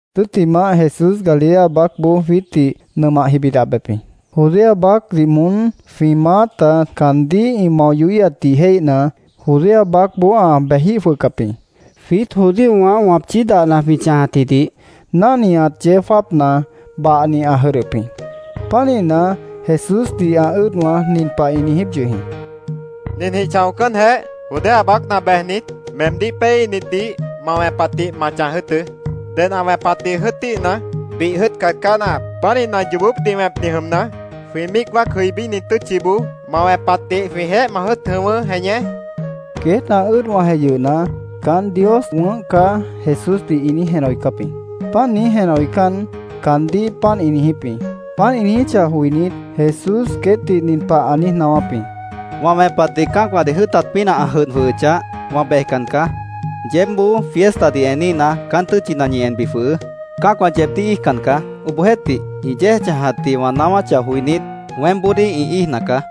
Tʉ́ttimah, Jesús Galilea baácboó jwiítdih nʉmah jibidih ã bejep jĩ. Judea baácdih moón jwĩ maáta caandíh ĩ mao yohíhatdih jéihna, Judea baácboó ã bejíh jwʉhcap jĩ. Jwiít judíowã wãpchí dahna jwĩ chãjatjidih náhniat yeó jáapna, bahni ã jʉdhdʉp jĩ. Pánihna, Jesúsdih ã ʉ́ʉdwã nin pah ĩ niijíp yʉh jĩ: —Ninjĩh chãocánjeh, Judea baácna bejnit, meemdíh péeíhnitdih ma wẽpatjĩh ma chãj jʉ́ʉtʉ́. Ded ã wẽpatdih jʉ́ʉtíhna, bih jʉ́ʉtcat caá náahap. Pánihna, yoobópdih wẽpni jʉmna, jwĩ míic wáac jʉibíni tʉ́tchiboó ma wẽpatdih jwĩjeéh ma jʉ́ʉt jʉ̃ʉ́wʉ́, Jeñé, ĩ niijíp jĩ. Queét ã ʉ́ʉdwãjeh yʉhna, ‘Caán Dios wʉ̃ʉ́h caá’, Jesúsdih ĩ niíj jenah joicáp jĩ. Páant niíj jenah joicán, caandíh páant ĩ niijíp jĩ. Páant ĩ niijíchah joinít, Jesús queétdih nin pah ã niíj naáwáp jĩ: —Wã wẽpatdih cã́acwãdih jʉ́ʉtat pínah ã jʉdh jwʉhʉchah, wã bejcan caá. Yeébboó fiestadih eníhna, caán tʉ́tchina ñi enbi jwʉhʉʉ́. Cã́acwã yeebdíh ĩ íijcan caá. Obohjeéhtih, ĩ yéej chãjatdih wã naáwáchah joinít, weémboodíh ĩ íijna caá.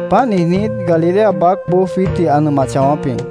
Páant niijnít, Galilea baácboó jwiítdih ã nʉmah chãwáp jĩ.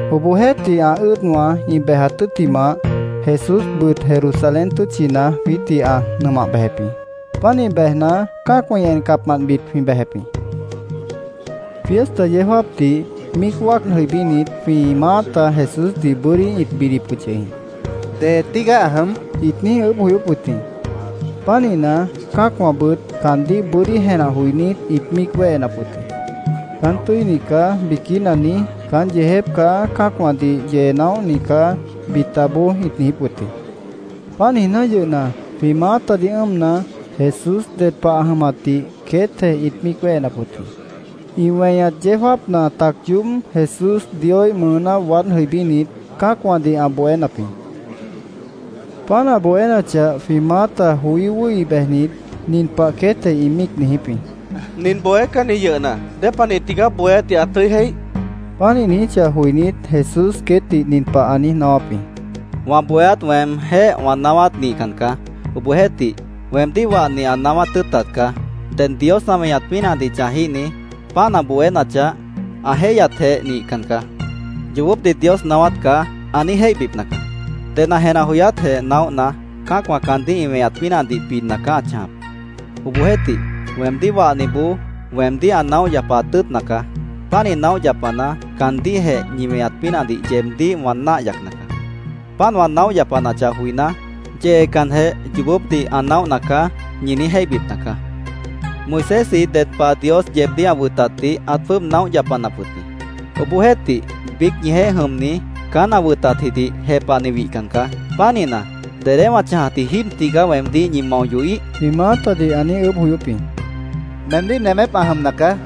Obohjeéhtih, ã ʉ́ʉdwã ĩ bejat tʉ́ttimah, Jesúsbʉt Jerusalén tʉ́tchina jwiítdih ã nʉmah bejep jĩ. Pánih bejna, cã́acwã ĩ encapmantbit jwĩ bejep jĩ. Fiesta yeó jáapdih míic wáac jʉibínit, jwĩ maáta Jesúsdih bʉ́dí ĩt bidip wʉt yʉh jĩ. —¿Dee tígaá ã jʉm? ĩt niíj ʉʉ́bh joyóp wʉt jĩ. Pánihna, cã́acwãbʉt caandíh bʉ́dí jenah joinít, ĩt míic wéhenap wʉt jĩ. “Caán tʉ́ini caá”, biquína niíj, “Caán yeejép caá. Cã́acwãdih yee naóhni caá”, bitaboó ĩt niijíp wʉt jĩ. Páant niijná yʉhna, jwĩ maátadih ʉ́ʉmna, Jesús ded pah ã jʉmatdih queétjeh ĩt míic wéhenap wʉt jĩ. Ĩ weñat yeó jáapna tac yoób Jesús Dioíh mʉʉná waád jʉibínit, cã́acwãdih ã bohénap jĩ. Páant ã bohénachah, jwĩ maáta joí wʉ́hi bejnit, nin pah queétjeh ĩ míic niijíp jĩ: —¿Nin bohécanni yʉhna, dépanih tigaá bohéátdih ã tʉ́i jéih? ĩ míic niijíp jĩ. Páant ĩ niijíchah joinít, Jesús queétdih nin pah ã niíj naáwáp jĩ: —Wã bohéát weemjéh wã naáwát nihcan caá. Obohjeéhtih, weemdíh wahni ã naáwát tʉ́ʉtat caá. Ded Dios ã weñat pínahdih chãjíhni ‘Páant ã bohénachah, ã jéihyatjeh nihcan caá. Yoobópdih Dios naáwát caá’, ã niíj jéihbipna caá. Ded ã jenah joyátjeh naóhna, cã́acwã caandíh ĩ weñat pínahdih bidna caá ã chãjap. Obohjeéhtih, weemdíh wahniboó weemdíh ã naóh yapaat tʉ́ʉtna caá. Pánih naóh yapana, caandíhjeh ñi weñat pínahdih yeebdíh wã náah yacna caá. Páant wã naóh yapanachah joiná, ‘Yeecanjeh, yoobópdih ã naóhna caá’, ñi niíj jéihbipna caá. “Moisésji ded pah Dios yeebdíh ã wʉtatdih ãt jwʉ́ʉb naóh yapanap wʉt jĩ. Obohjeéhtih, biíc ñijeéh jʉmni caán ã wʉtatjidih jepahni wihcan caá. Pánihna, ¿dedé wã chãjatji jíib tigaá weemdíh ñi mao yohíh?” jwĩ maátadih ã niíj ʉʉ́bh joyóp jĩ. —Meemdíh nemép ã jʉmna caá.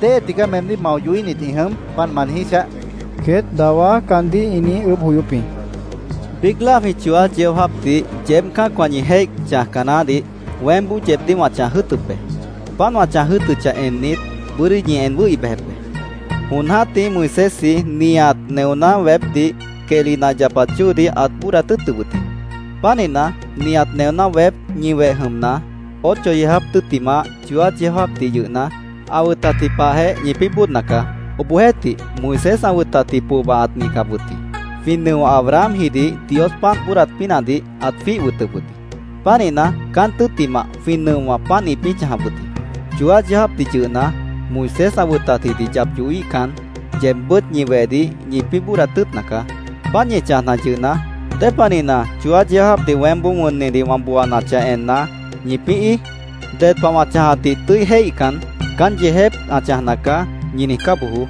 ¿Déhe tigaá meemdíh mao yohíhnit ĩ jʉm, páant ma niijíchah? queét dawá caandíh ĩ niíj ʉʉ́bh joyóp jĩ. —Biíc láa jwĩ chooát yeó jáapdih yeéb cã́acwã ñi jéih chãjca naáhdih weémboó yeebdíh wã chãj jʉ́ʉtʉp be. Páant wã chãj jʉ́ʉtʉchah ennit, bʉ́dí ñi en wʉ́hi bejep be. Jon jã́tih Moisésji nihat neoná weépdih quehli nah yapat chóodih ãt bóodat tʉ́ʉtʉp wʉt jĩ. Pánihna, nihat neoná weép ñi weh jʉmna, ocho yeó jáap tʉ́ttimah chooát yeó jáapdih yʉhna, ã wʉtatji pahjeh ñipĩ́ bóodna caá.Obohjeéhtih, Moisés ã wʉtatji pohba ãt nihcap wʉt jĩ. Jwĩ nʉo Abrahamjidih Dios páant bóodat pínahdih ãt jwíih wʉtʉp wʉt jĩ.Pánihna, caán tʉ́ttimah, jwĩ nʉowã páant ĩpĩ́ chãjap wʉt jĩ. Chooát yeó jáapdih yʉhna, Moisés ã wʉtatjidih yap yohíhcan, yeebbʉ́t ñi wehdih ñipĩ́ bóodat tʉ́ʉtna caá. Páant ñi chãjna yʉhna, ¿dépanihna, chooát yeó jáapdih weémboó wʉnnidih wã booanachah enna, ñipĩ́ íij? Ded pah wã chãjatdih tʉ́i jéihcan, ‘Caán yeejép ã chãjna caá’, ñi niijcá bojoó.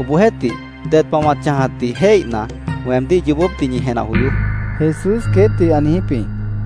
Obohjeéhtih, ded pah wã chãjatdih jéihna, weemdíh yoobópdih ñi jenah joyoó, Jesús queétdih ã niijíp jĩ.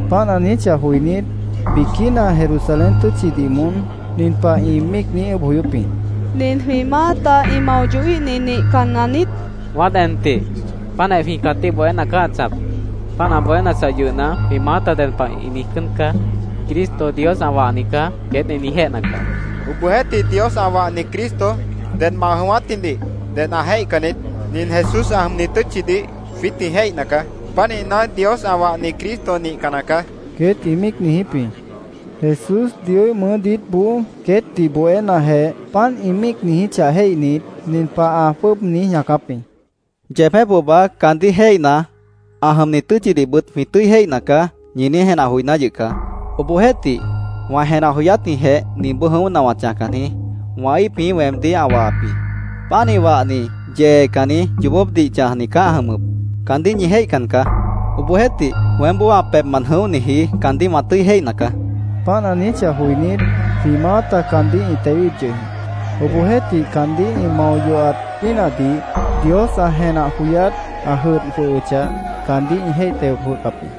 Páant ã niijíchah joinít, biquína Jerusalén tʉ́tchidih moón nin pah ĩ míic niíj ʉʉ́bh joyóp jĩ: —¿Nin jwĩ maáta ĩ mao yohíhni nihcanna niít? Wãát en tih. Páantjeh jwĩ cãtíh bohéna caá ã chãjap. Páant ã bohénachah yʉhna, jwĩ maáta ded pah ĩ niijcán caá. ‘Cristo, Dios ã wahni caá’, queét ĩ niijjéhna caá. Obohjeéhtih, Dios ã wahni Cristo dedmant ã jʉ̃ʉ́wátjidih ded ã jéihcan niít. Nin Jesús ã jʉmni tʉ́tchidih jwiít jwĩ jéihna caá. Pánihna, Dios ã wahni Cristo nihcanna caá, queét ĩ míic niijíp jĩ. Jesús Dioíh mʉʉ́ diítboó queétdih bohénajeh, páant ĩ míic niijíchah jéihnit, nin pah ã jwʉ́ʉb niíj ñaacáp jĩ: —Yeebjéh pohba ‘Caandíh jéihna, ã jʉmni tʉ́tchidihbʉt jwĩ tʉ́i jéihna caá’, ñi niíj jenah joiná yʉh caá. Obohjeéhtih, wã jenah joyátjĩhjeh ninboó jʉ̃óhna wã chãjcan jĩí. Wã íip jĩí weemdíh ã wahap jĩ. Pánih wahni yeecanni, yoobópdih chãjni caá ã jʉmʉp. Caandíh ñi jéihcan caá. Obohjeéhtih, weémboó ã pebhmant jʉ̃óhniji caandíh wã tʉ́i jéihna caá, ã niijíp jĩ. Páant ã niijíchah joinít, jwĩ maáta caandíh ĩ tewíhip yʉh jĩ. Obohjeéhtih, caandíh ĩ mao yohat pínahdih Dios ã jenah joyát ã jʉdh jwʉhʉchah, caandíh ĩ jéih teo jwʉhcap jĩ.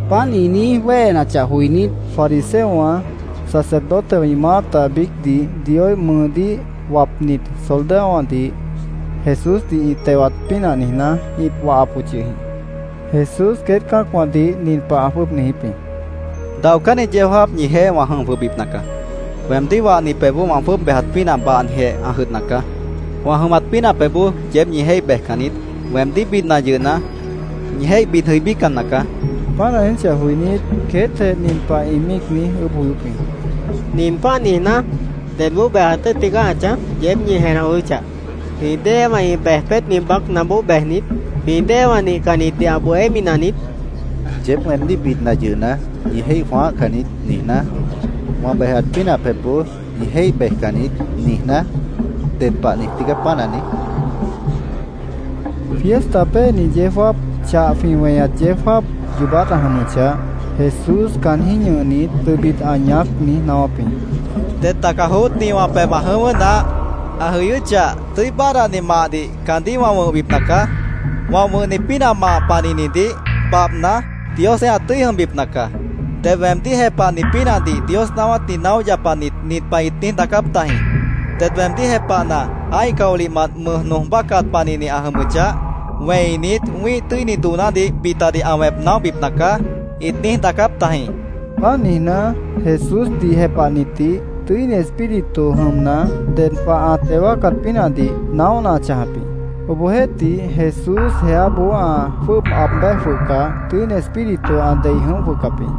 Páant ĩ niíj wéhenachah joinít, fariseowã, sacerdotewã ĩ maáta biícdih Dioíh mʉʉdíh wapnit soldadowãdih Jesúsdih ĩ tewat pínah niijná, ĩt wahap wʉt yʉh jĩ. Jesús queét cã́acwãdih nin pah ã jwʉ́ʉb niijíp jĩ: —Daocánni yeó jáap ñijeéh wã jʉm jwʉhbipna caá. Weemdíh wahni pebhboó wã jwʉ́ʉb bejat pínah bahnijeh ã jʉdhna caá. Wã jʉmat pínah pebhboó yeéb ñi jéih bejcan niít. Weemdíh bidna yʉhna, ñi jéih bid jʉibícan nacaá, ã niijíp jĩ. Páant ã niijíchah joinít, queétjeh nin pah ĩ míic niíj ʉʉ́bh joyóp jĩ: —Nin páant niijná, ¿dedboó bejat tʉ́ʉt tigaá ã chãj? yeéb ñi jenah joyóchah. ¿Jwĩ déewã ĩ bej peétni baácnaboó bejnit, jwĩ déewã nihcannitdih ã bohémi naniít? ‘Yeéb weemdíh bidna yʉhna, ñi jéih jwãáhcan niít’, niijná, ‘Wã bejat pínah pebhboó ñi jéih bejcan niít’, niijná, ¿ded pah niij tígaá páant ã niíj? ĩ míic niijíp jĩ. Fiesta péeni yeó jáap, chah jwĩ weñat yeó jáap yoobát ã jʉmʉchah, Jesús caanjĩ́h ñʉhnit, tʉbit ã ñaác niíj naáwáp jĩ: —Ded taca joótni wã pebh ã jʉ̃ʉ́wʉ́ naáh. Ã jʉyʉ́chah, tʉ́i báadhdani mahdih caandíh wã wʉ̃hbipna caá. Wã wʉ̃hni pínah mah panihnidih babhna, Diosjeéh ã tʉ́i jʉmbipna caá. Ded weemdíh jepahni pínahdih Dios naáwátdih naóh yapanit nin pah ĩt niíj daacáp tajĩ: ‘Ded weemdíh jepahna, ã́ih caolihmant mʉj nooj bácat panihni ã jʉmʉchah, wẽinit wĩ́ih tʉ́ini doonádih bitadih ã wẽp naóhbipna caá’, ĩt niíj daacáp tajĩ, ã niijíp jĩ. Páant niijná, Jesúsdih jepahnitdih Tʉ́ini Espíritu jʉmna, ded pah ã teo wáacat pínahdih naóhna ã chãjap jĩ. Obohjeéhtih, Jesús jeáboó ã jwʉ́ʉb aab béj jwʉhcah, Tʉ́ini Espíritu ã dei jʉ̃óh jwʉhcap jĩ.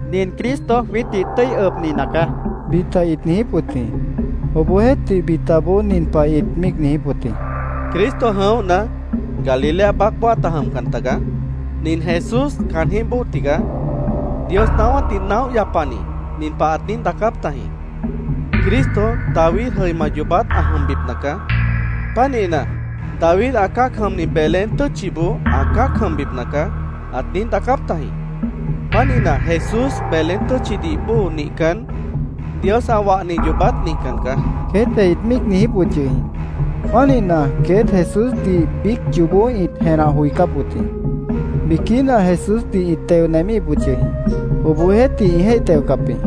—Nin Cristo jwiítdih tʉ́i ʉbni nacaá, bita ĩt niijíp wʉt jĩ. Obohjeéhtih, bitaboó nin pah ĩt míic niijíp wʉt jĩ: —Cristo jʉ̃óhna, Galilea baácboó ãta jʉmcan tagaá. Nin Jesús caanjĩ́h bóo tigaá. Dios naáwátdih naóh yapani nin pah ãt niíj daacáp tajĩ. ‘Cristo David jʉima yoobát ã jʉmbipna caá. Pánihna, David ã cã́ac jʉmni Belén tʉ́tchiboó ã cã́ac jʉmbipna caá’, ãt niíj daacáp tajĩ. Pánihna, Jesús Belén tʉ́tchidih bóo nihcan, Dios ã wahni yoobát nihcan caá, queétjeh ĩt míic niijíp wʉt yʉh jĩ. Pánihna, queét Jesúsdih biíc yoobó ĩt jenah joicáp wʉt jĩ. Biquína Jesúsdih ĩt teo nemíhip wʉt yʉh jĩ. Obohjeéhtih, ĩ jéih teocap jĩ.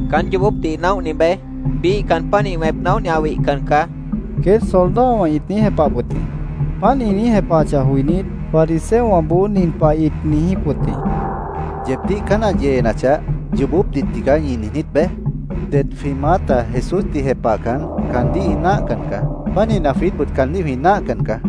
—Caán yoobópdih naóhni beé. Biíh caan pánih wẽp naóhni ã wihcan caá, queét soldadowã ĩt niíj jepahap wʉt jĩ. Páant ĩ niíj jepahachah joinít, fariseowãboó nin pah ĩt niijíp wʉt jĩ: —¿Yeebdíh caán ã yeenachah, ‘Yoobópdih tigaá’, ñi niijnít beé? Det jwĩ maáta Jesúsdih jepahcan, caandíh ĩ náahcan caá. Pánihna, jwiítbʉt caandíh jwĩ náahcan caá.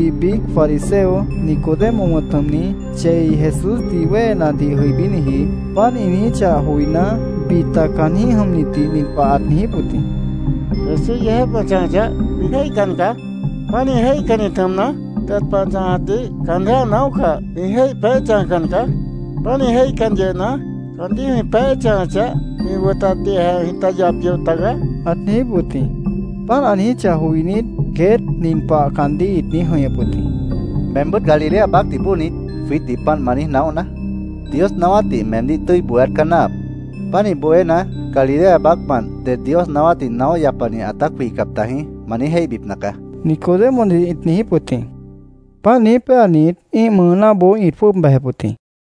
Obohjeéhtih, biíc fariseo, Nicodemo wʉ̃t jʉmni, chei Jesúsdih wéhenadih jʉibíniji, páant ĩ niijíchah joiná, bita caanjĩ́h jʉmnitdih nin pah ãt niijíp wʉt jĩ: —Jesús yeejép ã chãjachah, jwĩ jéihcan caá. Pánih jéihcannit jʉmna, ded pah ã chãjatdih caanjéh ã naóhcah, jwĩ jéih peéh chãjcan caá. Pánih jéihcan yʉhna, caandíh jwĩ peéh chãjachah, jwĩ wʉtatdihjeh jwĩta yap yoh tagaá, ãt niijíp wʉt jĩ. Páant ã niijíchah joinít, queét nin pah caandíh ĩt niíj jʉ̃ihñʉp wʉt jĩ: —¿Meembʉ́t Galilea baácdih bóo niít, jwiítdih páant ma niíj naóhna? Dios naáwátdih meemdíh tʉ́i bohéát caá náahap. Pánih bohéna, ‘Galilea baácmant ded Dios naáwátdih naóh yapani ãtát wihcap tajĩ’, ma niíj jéihbipna caá, Nicodemodih ĩt niijíp wʉt jĩ. Páant niíj péanit, ĩ́ih mʉʉnáboó ĩt jwʉ́ʉb bejep wʉt jĩ.